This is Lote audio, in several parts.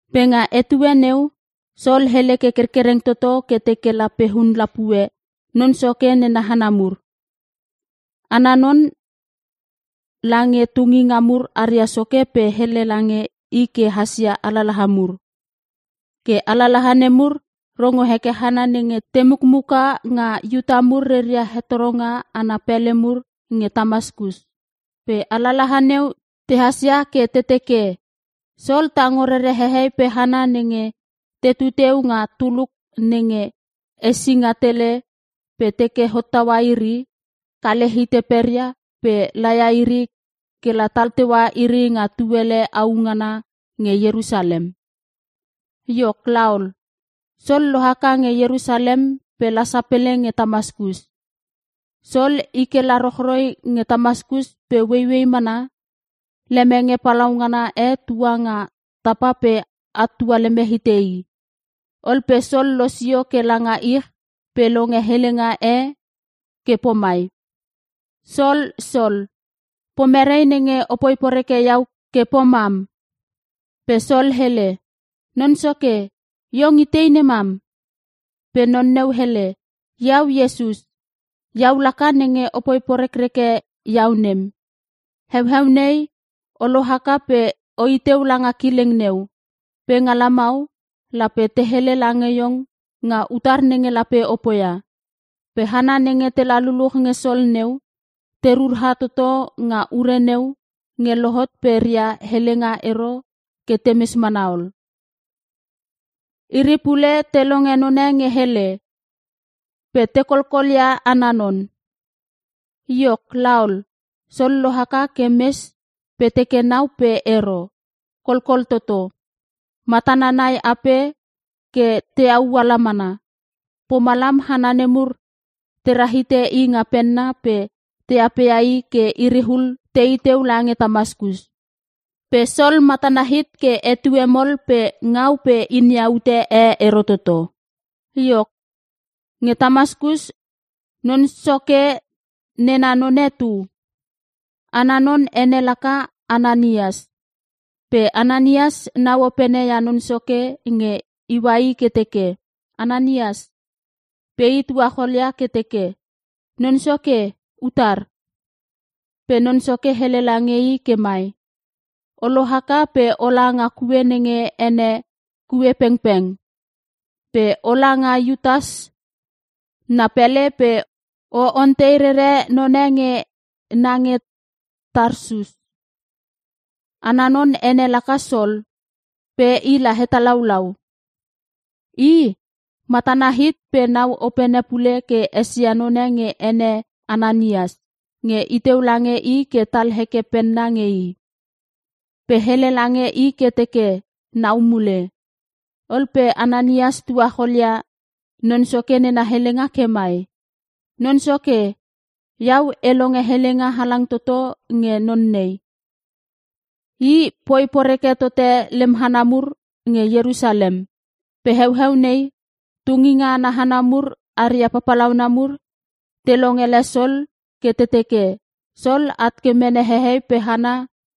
Pe nga etue neu, Sol hele ke kerkereng toto ke teke lape hun lapue Non Soke nena hana mur. Ana non, lange tunginga mur aria soke pe hele lange i ke hasia alalaha mur. Ke alalaha nemur rongo heke hana nenge te mukmuka nga Iuta mur reia hetoronga ana pele mur nge Tamaskus. Pe alalaha neu tehas ia ke te teke, Sol tango rere hehei pe hana nenge tetu teu nga tuluk nenge Esinga Tele pe teke hottaua iri, kale hite peria pe laia iri kela tal teua iri nga tuele au ngana nge Ierusalem. Iok laol, Sol lohaka nge Ierusalem pe la sapele nge Tamaskus. Sol i kela rochroi nge Tamaskus pe ueiuei mana lemenge palaungana e tua nga tapa pe at tualeme hite i. Ol pe Sol losio ke langa ich pe longe helenga e ke pomai, “Sol, Sol, pomere nenge opoi poreke iau ke pomam?” Pe Sol hele, “Non Soke, iong itei nemam?” Pe non neu hele, “Iau Iesus. Iau laka nenge opoi porekreke iau nem. Heueu nei, o lohaka pe oiteu langa kileng neu. Pe nga lamau, lape te hele lange iong nga utar nenge lape o poia.” Pe hana nenge tela luluch nge Sol neu, te rura toto nga ure neu nge lohot pe reia helenga ero ke temes mana ol. Iri pule te longe none nge hele, pe te kolkolia ana non. Iok laol, Sol lohaka ke mes pe teke nau pe ero, kolkol toto. Matana nai ape ke teau ala mana. Pomalam hana nemur tera hite i nga penna pe te apea i ke iriul tei teu lange Tamaskus. Pe Sol matana hit ke etue mol pe ngau pe inia ute e ero toto. Iok, nge Tamaskus, Non Soke nena none tu. Ana non ene laka Ananias. Pe Ananias nau openene ia Non Soke nge iua i ke teke, “Ananias!” Pe i tuacholia ke teke, “Non Soke, utar?” Pe Non Soke hele lange i ke mai, “O lohaka pe ola nga kue nenge ene, ‘Kue Pengpeng’. Pe ola nga Iutas na pele pe o ontei rere none nge na nge Tarsus. Ana non ene laka Sol, pe i la hetalaulau. I, matana hit pe nau opene pule ke esia none nge ene Ananias nge iteu lange i ke tal heke penna nge i, pe hele lange i ke teke nau mule.” Ol pe Ananias tuacholia Non Soke nena helenga ke mai, “Non Soke, iau e longe helenga halang toto nge non nei. I, poi poreke totote lem hana mur nge Ierusalem. Pe heueu nei, tunginga ana hana mur aria papalauna mur, te longele Sol ke te teke, Sol at ke mene hehei pe hana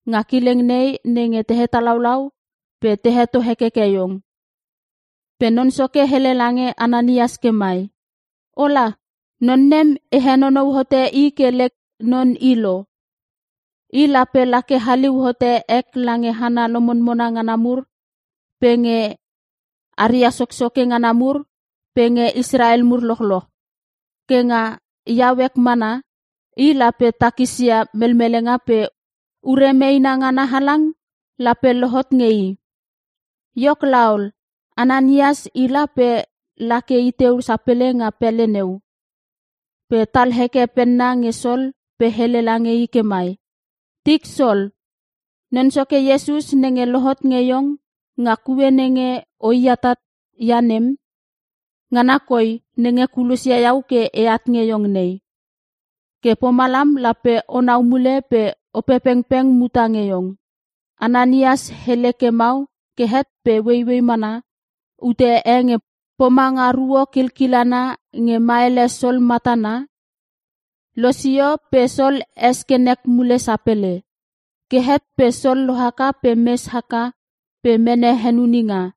nga kileng nei nenge te hetalaulau pe te heto hekeke iong.” Pe Non Soke hele lange Ananias ke mai, “Ola! Non nem e henonou hote i ke lek non i lo. I lape lake haliu hote ek lange hana lomonmona ngana mur pe nge aria soksoke ngana mur pe nge Israel mur lochloch. Ke nga iau ek mana, i lape takisia melmelenga pe ure meena ngana halang lape lohot nge i.” Iok laol, Ananias i la pe la ke i teu sapele nga pele neu. Pe tal heke penna nge Sol pe hele lange i ke mai, “Tik Sol, Non Soke Iesus nenge lohot nge iong nga kue nenge oi atat ia nem, ngana koi nenge kulosia iau ke eat nge iong nei. Ke pomalam lape onau mule pe Opepengpeng muta nge iong.” Ananias hele ke mau ke het pe ueiuei mana ute e nge pomanga ruo kilkilana nge maele Sol matana, losio pe Sol es ke nek mule sapele. Ke het pe Sol lohaka pe mes haka pe mene henuninga.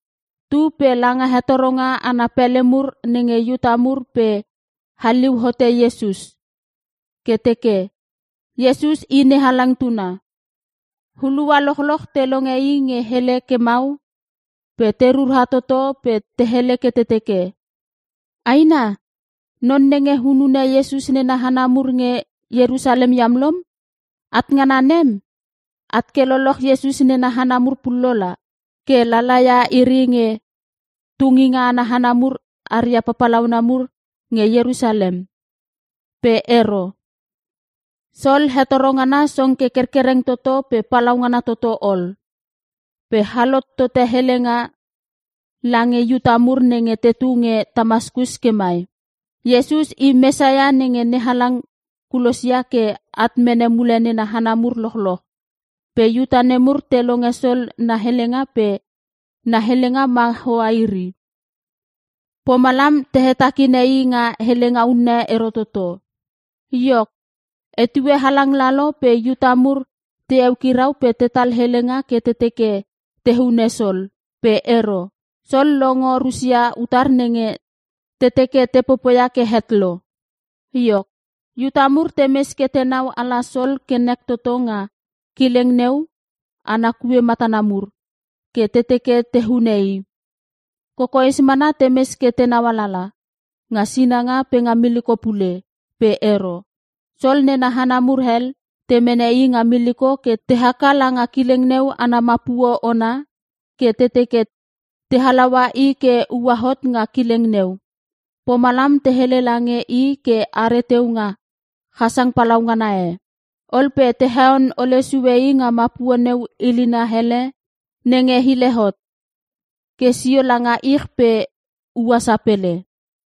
Tu pe langa hetoronga ana pele mur nenge Iuta mur pe haliu hote Iesus, ke teke, “Iesus i NeHalang tuna.” Hulua lochloch te longe i nge hele ke mau, pe te rura toto pe te hele ke te teke, “Aina! Non nenge hunune Iesus nena hana mur nge Ierusalem iam lom. At ngana nem, at ke lololoch Iesus nena hana mur pullo la. Ke lalaia iri nge tunginga ana hana mur aria papalauna mur nge Ierusalem.” Pe ero. Sol hetoro ngana song ke kerkereng toto pe palaungana toto ol. Pe halot tote helenga lange Iuta mur nenge tetu nge Tamaskus ke mai, “Iesus i Mesias nenge NeHalang kulosia ke at mene mule nena hana mur lochloch.” Pe Iuta nemur te longe Sol na helenga pe na helenga ma hoa iri. Pomalam te hetakine i nga helenga unne ero toto. Iok, etue halang lalo pe Iuta mur te eukirau pe tetal helenga ke te teke te hune Sol. Pe ero. Sol longo rusia utar nenge te teke te popoia ke het lo. Iok, Iuta mur temes ke tenau ala Sol ke nek toto nga kileng neu ana kue matana mur, ke te teke te hunune i. Kokoes mana temes ke tenau alala, nga sinanga pe nga miliko pule. Pe ero. Sol nena hana mur hel te mene i nga miliko ke te haka langa kileng neu ana mapuo ona, ke te teke te halaua i ke uahot nga kileng neu. Pomalam te hele lange i ke are teu nga chasang palaungana e. Ol pe te heon ole sue i nga mapuo neu hilina ele nenge hile hot, ke sio langa ich pe ua sapele.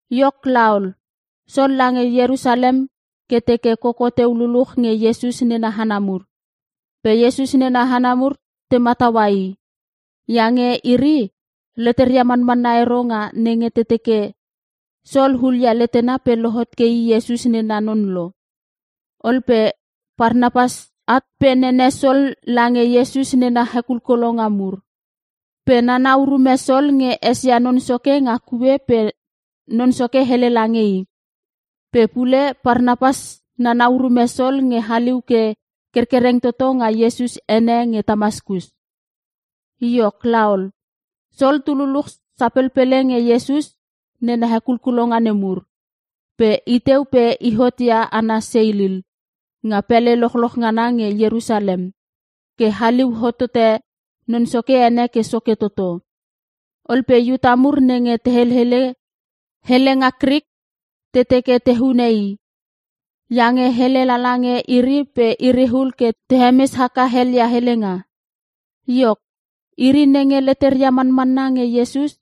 Iok laol, Sol lange Ierusalem ke teke koko teu luluch nge Iesus nena hana mur. Pe Iesus nena hana mur te mataua i. Iange iri, leteria manmanna ero nga nenge te teke, Sol hulia letena pe lohot ke i Iesus nena non lo. Ol pe Parnapas at pe nene Sol lange Iesus nena hekulkulonga mur. Pe nana urume Sol nge esia Non Soke nga kue pe Non Soke hele lange i. Pe pule Parnapas nana urume Sol nge haliu ke kerkereng toto nga Iesus ene nge Tamaskus. Iok laol, Sol tu luluch sapelpele nge Iesus nena hekulkulonga nemur. Pe iteu pe ihot ia ana seilil nga pele lochloch ngana nge Ierusalem ke haliu hotote Non Soke ene ke soke toto. Ol pe Iuta mur nenge te helele helenga Krik te teke te hune i, iange hele lala nge iri pe iriul ke te hemes haka helelia helenga. Iok, iri nenge leteria manmanna nge Iesus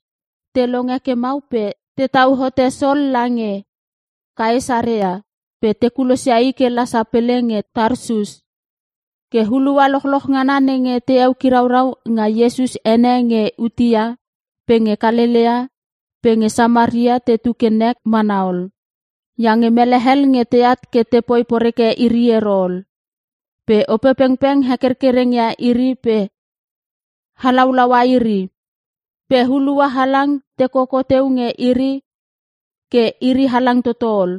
te longe ke mau pe te tau hote Sol lange Kaesarea pe te kulosia i ke la sapele nge Tarsus. Ke hulua lochloch ngana nenge te ekiraurau nga Iesus ene nge Iutea pe nge Kalelea pe nge Samaria tetu ke nek mana ol. Iange mele hel nge teat ke tepoi poreke iri ero ol. Pe Opepengpeng hekerkereng ia iri pe halaulaua iri. Pe hulua halang te koko teu nge iri ke iri halang toto ol.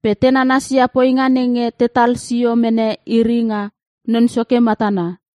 Pe te nanasia poinga nenge tetal sio mene iri nga Non Soke matana.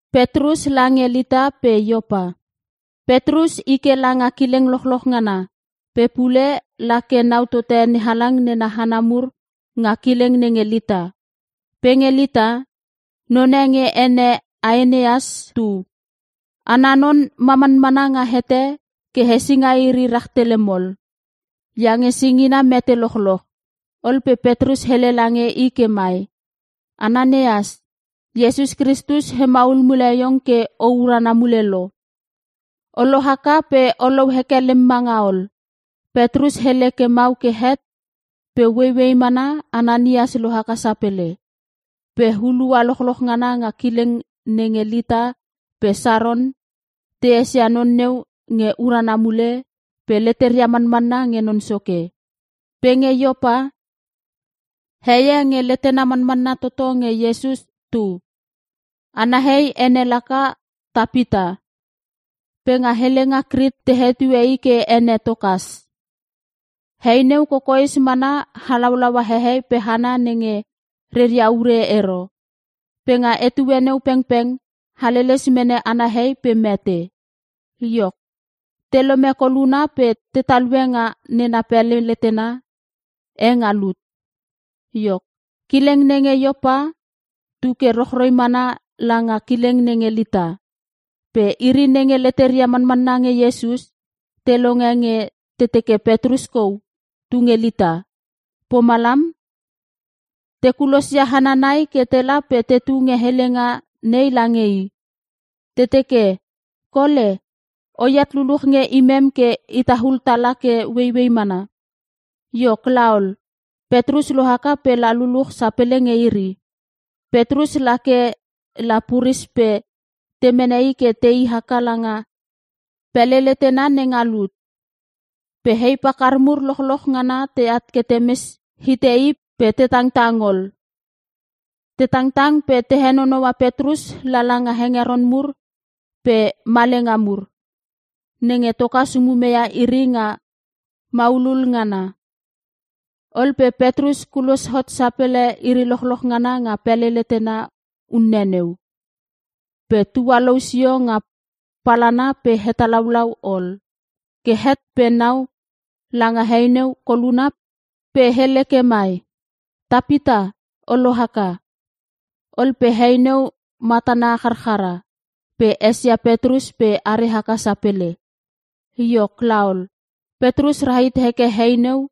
Petrus i ke langa kileng lochloch ngana, pe pule lake nau tote NeHalang nena hana mur nga kileng nenge Lita. Pe nge Lita, none nge ene Aeneas tu. Ana non ma manmana nga hete ke hesinga iri rahtele mol, iange singina mete lochloch. Ol pe Petrus hele lange i ke mai, “Aeneas, Iesus Kristus hemaul mule iong ke o urana mule lo. O lohaka pe olou heke lem manga ol.” Petrus hele ke mau ke het, pe ueiuei mana Aeneas lohaka sapele. Pe hulua lochloch ngana nga kileng nenge Lita pe Saron, te esia non neu nge urana mule, pe leteria manmanna nge Non Soke. Pe nge Iopa, heie nge letena manmanna toto nge Iesus tu. Ana hei ene laka Tapita. Pe nga helenga Krik te hetue i ke ene Tokas. Hei neu kokoes mana halaulaua hehei pe hana nenge reria ure ero. Pe nga etue neu pengpeng haleles mene ana hei pe mete. Iok, telome koluna pe te talue nga nena pele letena e nga lut. Iok, kileng nenge Iopa, tuke rochroi mana langa kileng nenge Lita. Pe iri nenge leteria manmanna nge Iesus, te longe nge te teke Petrus kou tunge Lita. Pomalam, te kulosia hana nai ke tela pe te tunge helenga nei lange i. Te teke, “Kole, oat luluch nge imem ke itaul tala ke ueiuei mana.” Iok laol, Petrus lohaka pe la luluch sapele nge iri. Petrus lake la puris pe te mene i ke tei haka langa pele letena nenga lut. Pe hei pakar mur lochloch ngana teat ke temes ite i pe te tangtang ol. Te tangtang pe te henonoua Petrus lala nga hengeron mur pe malenga mur, nenge Tokas umemeia iri nga maulul ngana. Ol pe Petrus kulos hot sapele iri lochloch ngana nga pele letena unne neu, pe tualou sio nga palana pe hetalaulau ol. Ke het pe, nau langa hei neu koluna pe hele ke mai, “Tapita, o lohaka!” Ol pe hei neu matana charchara, pe esia Petrus pe are haka sapele. Iok laol, Petrus rahit heke hei neu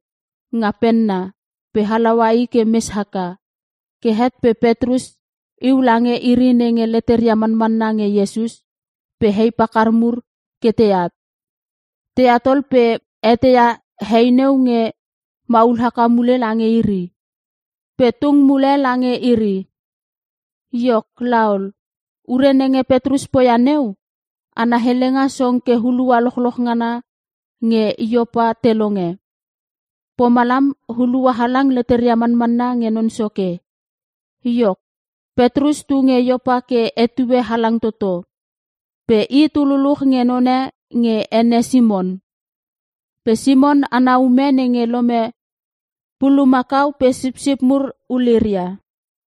nga penna, pe halaua i ke mes haka. Ke het pe Petrus iu lange iri nenge leteria manmanna nge Iesus, pe hei pakar mur ke teat. Teat ol pe eteia hei neu nge maul haka mule lange iri, pe tung mule lange iri. Iok laol, ure nenge Petrus poia neu, ana helenga song ke hulua lochloch ngana nge Iopa te longe. Pomalam, hulua halang leteria manmanna nge Non Soke. Iok, Petrus tu nge Iopa ke etue halang toto. Pe i tu luluch nge none nge ene Simon. Pe Simon ana ume nenge lome pulumakau pe sipsip mur uliria.